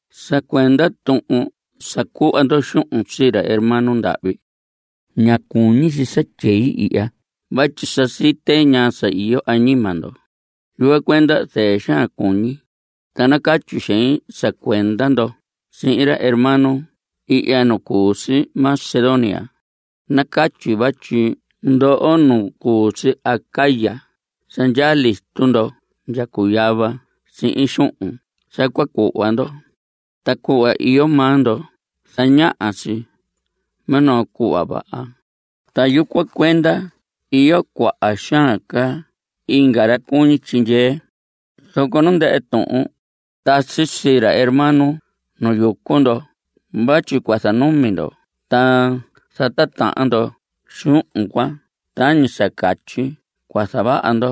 Sa cuenda tuhun sa cuhva ndo xuhun sii ra hermano ndahvi, ña cuñi si sa tyei ihya vatyi sa site ñaa sa iyo añima ndo. Yucuan cuenda zɨɨ xaan cuñi, ta nacatyi xein sa cuenda ndo sihin ra hermano ihya nu cu si Macedonia. Nacatyi vatyi ndoho nu cu si Acaya sa ndyaa listo ndo ndya cuyava sihin xuhun sa cua cuhva ndo. Ta cuhva iyo maa ndo zañaha si minoo cuhva vaha, ta yucuan cuenda iyo cuaha xaan ca inga ra cuñi tyindyee. Zoco nu ndɨhɨ tuhun, tasi sii ra hermano nu yucu ndo vatyi cua zanumi ndo ta zatitahan ndo xuhun cuan tañi sa catyi cua zavaha ndo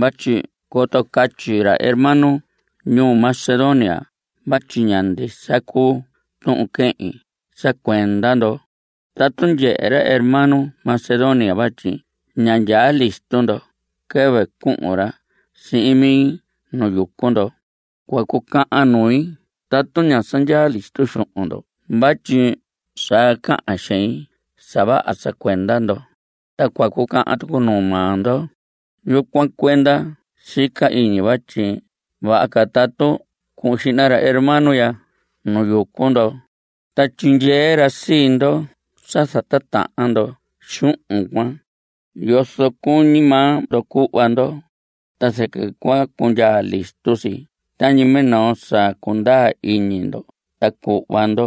vatyi coto catyi ra hermano ñuu Macedonia vatyi ña ndisa cuu tuhun quehin sa cuenda ndo. Tatu ndyehe ra hermano Macedonia vatyi ña ndyaa listo ndo quɨvɨ cuhun ra sihin mi nu yucu ndo, cua cucahan nui tatu ña sa ndyaa listo xuhun ndo vatyi sa cahan xein sa vaha sa cuenda ndo. Ta cua cucahan tucu nuu maa ndo. Yucuan cuenda sica iñi vatyi vaha ca tatu cuhun xihna ra hermano ya nu yucu ndo, ta tyindyee ra sii ndo sa zatitahan ndo xuhun cuan, yozo cuñi maa ndo cuhva ndo. Ta zɨquɨ cua cundyaa listo si tañi minoo sa cundaa iñi ndo ta cuhva ndo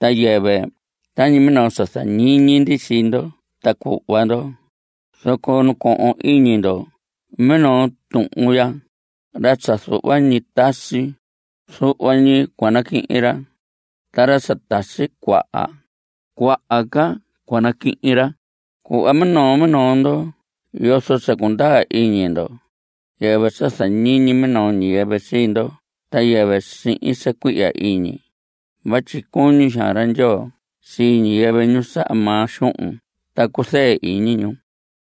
ta yɨvɨ tañi minoo sa zañiñi ndi sii ndo ta cuhva ndo. Zoco nacohon iñi ndo minoo tuhun ya; ra sa zuhva ñi tasi, zuhva ñi cua naquihin ra. Ta ra tasi cuaha, cuaha ca cua naquihin ra. Cuhva minoo minoo ndo yozo sa cundaa iñi ndo, yɨvɨ sa zañiñi minoo ñiyɨvɨ sii ndo ta yɨvɨ sihin sa cuihya iñi. Vatyi cuñi xaan ra Ndyoo sii ñiyɨvɨ, ñu saha maa xuhun ta cuzɨɨ iñi ñu.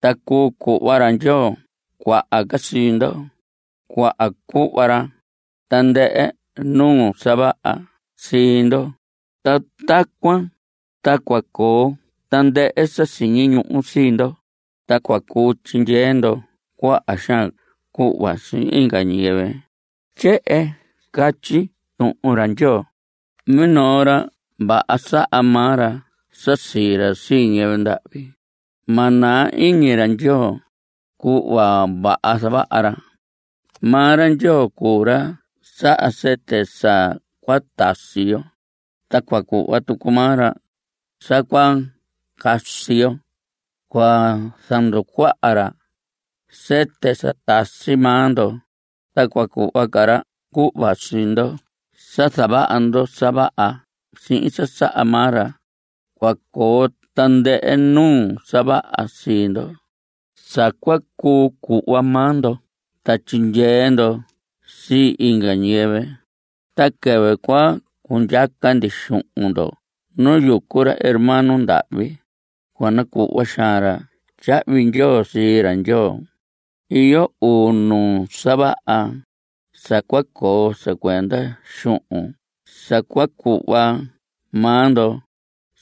Ta cuu cuhva ra Ndyoo cuaha ca sii ndo. Cua cuhva ra tandɨhɨ nuu sa vaha sii ndo. Ta tacuan ta cua coo tandɨhɨ sa siñi ñuhu sii ndo, ta cua cuu tyindyee ndo cuaha xaan cuhva sii inga ñiyɨvɨ. Tyehen catyi Tuhun ra Ndyoo: Minoo ra vaha, saha maa ra sa sii ra sii ñiyɨvɨ ndahvi. Ma naa iñi ra Ndyoo cuhva vaha zavaha ra. Maa ra Ndyoo cuu ra saha sɨtɨ sa cua tasi yo. Ta cua cuhva tucu maa ra sa cua casi yo. Cua zanducuaha ca ra sɨtɨ sa tasi maa ndo, ta cua cuhva ca ra cuhva sii ndo sa zavaha ndo sa vaha sihin sa saha maa ra. Cua coo tandɨhɨ nuu sa vaha sii ndo, sa cua cuu cuhva maa ndo ta tyindyee ndo sii inga ñiyɨvɨ. Ta quɨvɨ cua cundyaca ndi xuhun ndo nu yucu ra hermano ndahvi, cua nacuhva xaan ra tyahvi ndyoo sii ra Ndyoo. Iyo uu nuu sa vaha sa cua coo sa cuenda xuhun sa cua cuhva maa ndo.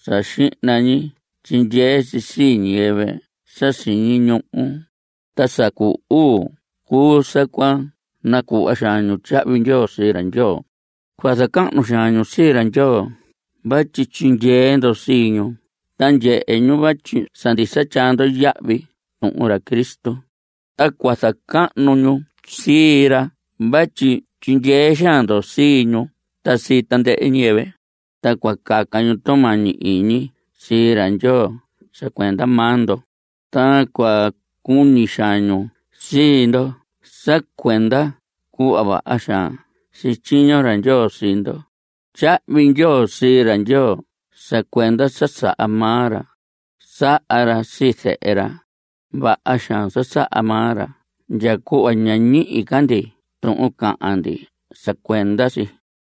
Sa xihna ñi tyindyee si sii ñiyɨvɨ sa siñi ñuhu. Ta sa cu uu cuu sa cua nacuhva xaan ñu tyahvi ndyoo sii ra Ndyoo. Cua zacahnu xaan ñu sii ra Ndyoo vatyi tyindyee ndo sii ñu ta ndyehe ñu vatyi sa ndisa tyaa ndo yahvi tuhun ra Cristo. Ta cua zacahnu ñu sii ra vatyi tyindyee xaan ndo sii ñu ta sii tandɨhɨ ñiyɨvɨ. Ta cua caca ñu tumañi iñi sii ra Ndyoo sa cuenda maa ndo, ta cua cuñi xaan ñu sii ndo sa cuenda cuhva vaha xaan sityiño ra Ndyoo sii ndo. Tyahvi ndyoo sii ra Ndyoo sa cuenda sa saha maa ra. Saha ra sii zehe ra. Vaha xaan sa saha maa ra ndya cuhva ña ñihi ca ndi tuhun cahan ndi sa cuenda si.